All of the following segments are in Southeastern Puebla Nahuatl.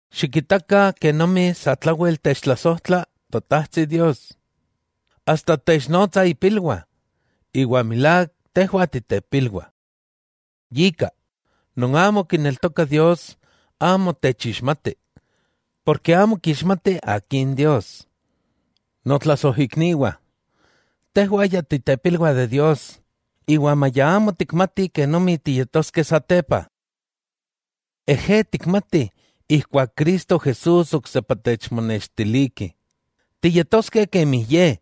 Xikitakah kenomi satlawel techtlasojtla Totajtsi Dios, asta technotsa ipilwah, iwa milák tejwah titepilwah. Yika, non amo kineltokah Dios amo techixmatih, porke amo kixmatih akin Dios. Notlasojikniwah, tejwah ya titepilwah de Dios, iwa maya amo tikmatih kenomi tiyetoskeh satepa. Ejé tikmatih ijkuak Cristo Jesús oksepa techmonextiliki, tiyetoskeh kemi Ye,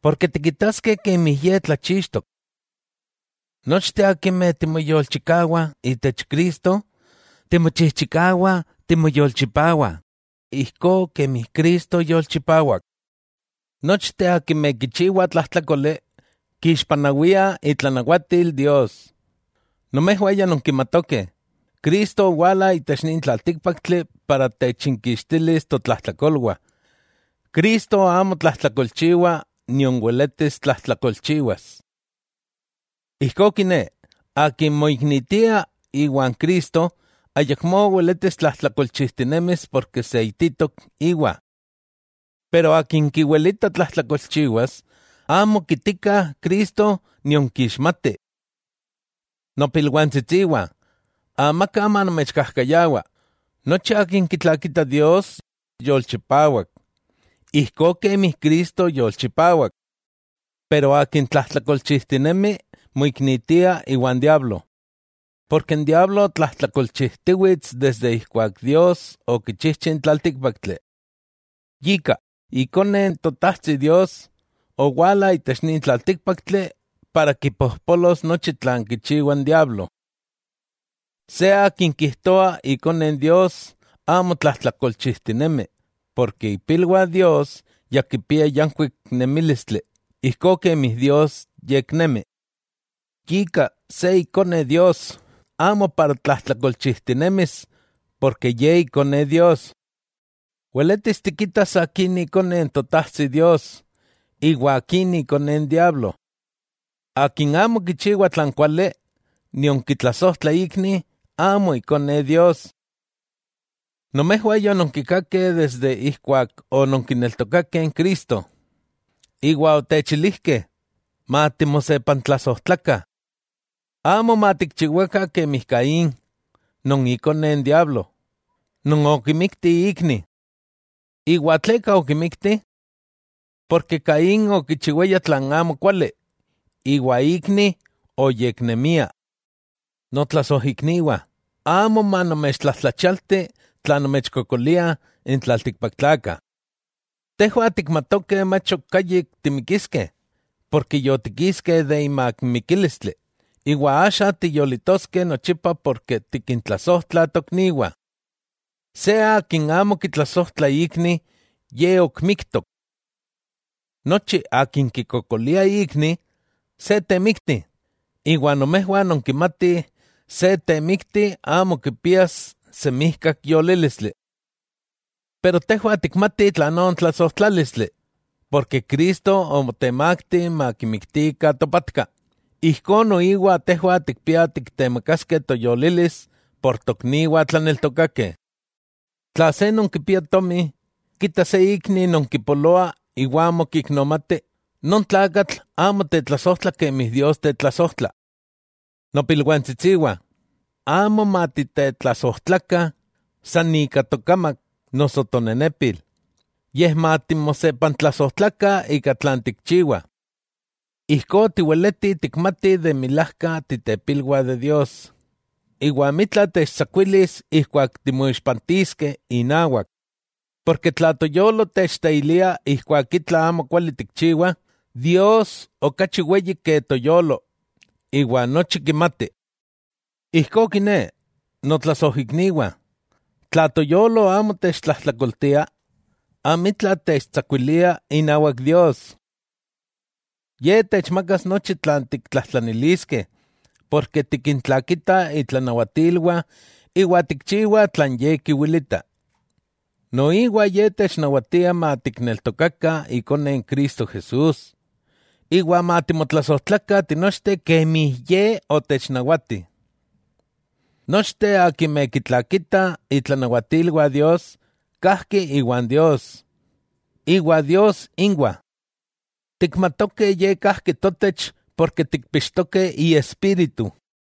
porke tikitaskeh kemi Ye tlachixtok. Nochteh akimeh timoyolchikawah itech Cristo, timochijchikawah timoyolchipawah, ijkó kemi Cristo yolchipawak. Nochteh akimeh kichiwah tlajtlákoli, kixpanawia itlanawatil Dios. Nomejwah ya nonkimatokeh, Cristo owala itech nin tlaltíkpaktli para techinkixtilis totlajtlakolwah, Cristo amo tlajtlakolchiwa nion weletis tlajtlakolchiwas. Ijkó kiné, akin moiknitia iwan Cristo, ayakmó weletis tlajtlakolchijtinemis ken seititok íwa. Iwa akin kiwelita tlajtlakolchiwas, amo kitika Cristo nion kixmati. Nopilwantsitsiwah, amaka manomechkajkayawa, nochi akin kitlakita Dios, yolchipawak, ijkó kemi Cristo yolchipawak. Iwa akin tlajtlakolchijtinemi moiknitia iwan diablo, porke n diablo tlajtlakolchijtiwits desde ijkuak Dios okichijchi n tlaltíkpaktli. Yika, Ikone n Totajtsi Dios, owala itech nin tlaltíkpaktli para kipojpolos nochi tlan kichiwa n diablo. Se akin kijtoa ikone n Dios amo tlajtlakolchijtinemi, porke ipilwah Dios ya kipia yankuik nemílistli ijkó kemi Dios yeknemi. Yika se ikone Dios amo para tlajtlakolchijtinemis, porke ye ikone Dios. Weletis tikitas akin ikone n Totajtsi Dios, iwa akin ikone n diablo. Akin amo kichiwa tlan kuali, nion kitlasojtla ikni, amo ikone Dios. Nomejwah yononkikakeh desde ijkuak ononkineltokakeh n Cristo, iwa otechilijkeh: matimosepantlasojtlakah. Amo matikchiwakah kemi Caín, ikone n diablo, non okimikti ikni. ¿Iwa tleka okimikti? Porke Caín okichiwaya tlan amokuali, iwa ikni oyeknemia. Notlasojikniwah, amo manomechtlajtlachialti tla nomechkokoliah n tlaltikpaktlakah. Tejwah tikmatokeh mach ok ayik timikiskeh, ken yotikiskeh imak mikílistli, iwa axa tiyolitoskeh nochipa porke tikintlasojtlah tokniwah. Se akin amo kitlasojtla ikni, ye ok miktok. Nochi akin kikokolia ikni, se temikti, iwa nomejwah nonkimatih se temikti amo kipias semijkak yolílistli. Tejwah tikmatih tlanó n tlasojtlálistli, porke Cristo omotemakti makimiktikah topatka, ijkó noiwa tejwah tikpiah tiktemakaskeh toyolilis por tokniwah tlaneltokakeh. Tla se non kipia tomi, kita se ikni non kipoloa iwa amo kiknomati, non tlakatl amo tetlasojtla kemi Dios tetlasojtla. Nopilwantsitsiwah, amo matitetlasojtlakah san ika tokamak noso tonenepil, yej matimosepantlasojtlakah ika tlan tikchiwah. Ijkó tiweletih tikmatih de milajka titepilwah de Dios, iwa amitla techtsakuilis ijkuak timoixpantiskeh inawak, tla toyolo techteilia ijkuak itla amo kuali tikchiwah, Dios okachi weyi ke toyolo, iwa nochi kimati. Ijkó kiné, notlasojikniwah, tla toyolo amo techtlajtlakoltia, amitla techtsakuilia inawak Dios. Ye techmakas nochi tlan tiktlajtlaniliskeh, porke tikintlakitah itlanawatilwah iwa tikchiwah tlan Ye kiwilita. Noiwa Ye technawatia matikneltokakah Ikone Cristo Jesús, iwa matimotlasojtlakah tinochteh kemi Ye otechnawatih. Nochteh akimeh kintlakitah itlanawatilwah Dios, kajki iwan Dios, iwa Dios inwah. Tikmatokeh Ye kajki totech porke tikpixtokeh Iespíritu.